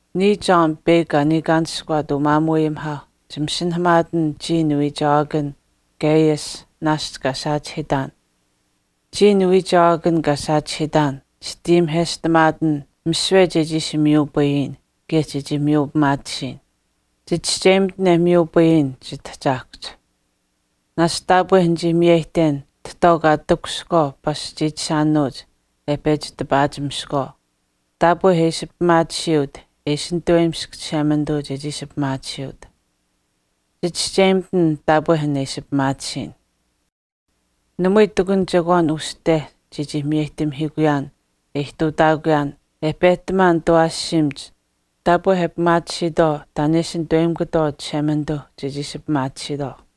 Niya John peyakw kaa niikaanishkuwaat umaamuuayimihaau chimasinahamaatin chiya niwiichewaakan Gaius, naashch kaa saachihiitaan. Chiya niwiichewaakan kaa saachihiitaan, chitayimiheshtamaatin misiwe chechii ishi miyupayin kaye chechii miyu pimaatisiyin. Chichischeyimitin e miyupayin chitahchaahkuhch. Naashch taapwe nichii miyeyihten tahtwaau kaa takushihkwaau pasch chiichishaanuuch e pechi tipaachimiskwaau taapwe e ishi pimaatisiyuut e ishi nituweyimisk Chishemanituu chechii ishi pimaatisiyut. Chichischeyimitin taapwe an e ishi pimaatisiyin. Namui ihtakun chekwaan uste chechii miyeyihtamihiikuyaan e ihtuutaakuyaan e pehtamaan nitawaashiimach taapwe e pimaatisiitwaau taan e ishi nituweyimikutwaau Chishemanituuh chechii ishi pimaatisiitwaau.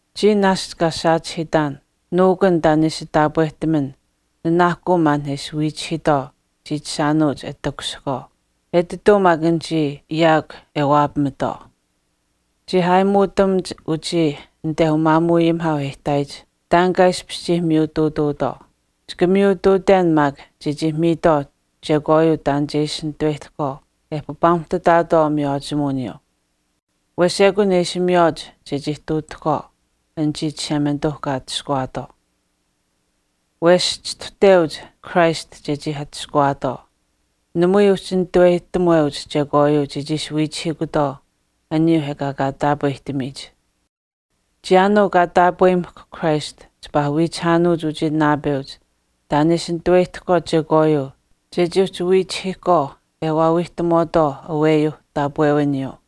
Chiya naashch kaa saachihiitaan, nuukun taan e ishi taapwehtaman nanaahkuu maan e ishi waawiichihiitwaau chiichishaanuuch e takushihkwaau, etituu maak anichii awenichii yaakw e waapamatwaau. Chii aayimuutamuch uchii anite umaamuuayimihaau e ihtaayich taan kaa ishpish miyutuutuutwaau. Chika miyutuuten maak chechii miitwaau chekwaayuu taan che ishi nituweyihtahkwaau e papaamuhtataatwaau miywaachimuwiniyuu. Wesh ekun e ishi miywaach chechii ihtuutuuhkwaau anichii Chishemanituuh kaa atushkuwaatwaau. Wesh chistuhteuch Christ chechii atushkuwaatwaau. Namui uhchi nitaweyihtamuweuch aniyuuh ekaa kaa taapwehtamiitwaau chekwaayuu chechii ishi wiichihiikutwaau. Chiyaanuu kaa taapweyimahkw Christ chipaa wiichihaanuuch uchii naapeuch taan e ishi nituweyihtahkwaau chekwaayuu chechii uhchi wiichihiihkwaau e waawiihtamutwaau aweyuuh taapwewiniyuu.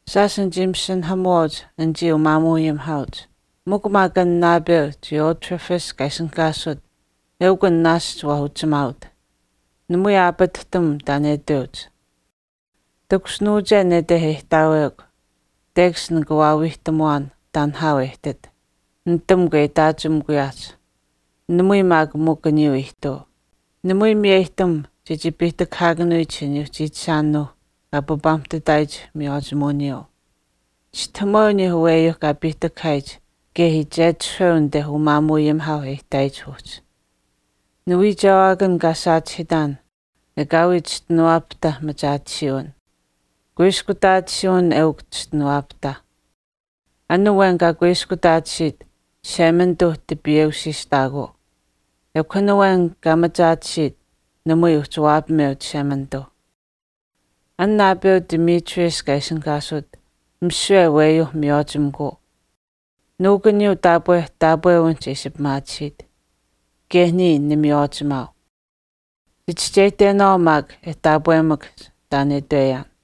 Shaash nichii masinahamuwaauch anichii umaamuuayimihaauch, mikw maak an naapeu Diotrephes kaa ishinihkaasut eukw an naashch waa uchimaaut, namui aapatihtam taan e itweuch. Takushinuuche anite e ihtaawekw tekash nika waawiihtamuwaan taan nihaau e ihtit, nitamukw e itaachimikuyaahch. Namui maak mikw aniyuu ihtuu. Namui miyeyihtam chechii piihtakahaakanuyich aniyuuh chiichishaaninuuh kaa papaamuhtataayich miywaachimuwiniyuu. Chistahamuweu aniyuuh aweyuuh kaa piihtakahaayich uyuuh kaye iichetishahweu anit umaamuuayimihaauh e ihtaayich uhchi. Niwiichewaakan kaa saachihiitaan ekaawii chischinuwaapahtah machaatisiiwin, kuiskutaatisiiwin eukw chischinuwaapahtah. An awen kaa kuiskutaatisiit Chishemanituu tipiweusiitutaakuu, ekw an awen kaa machaatisiit namui uhchi waapameu Chishemanituu. An naapeu Demetrius kaa ishinihkaasut misiwe aweyuu miywaachimikuu. Nuukuniyuu taapwe taapwewinihch e ishi pimaatisiit. Kaye niya nimiywaachimaau. Chichischeyihtenaawaau maak e taapwemakahch taan e itweyaan.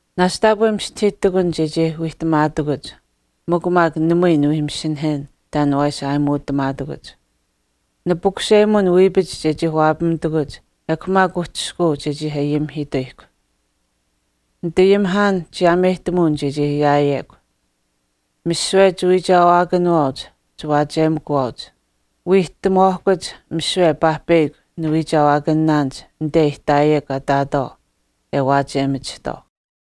Naashch taapwe mistahii ihtakun chechii wiihtamaatakuch, mikw maak namui niwii masinahen taan waa ishi aayimuutamaatakuch. Nipukuseyihten wiipach chechii waapamitakuch ekw maak uhchishkuu chechii ayimihiituyihkw. Nitayimihaan chiyaameyihtamuwin chechii ayaayekw. Misiwe chiwiichewaakanuwaauch chiwaachiyemikuwaauch. Wiihtamuwaahkuch misiwe paahpeyakw niwiichewaakanaanich anite e ihtaayekw kaa ihtaatwaau e waachiyemachihtwaau.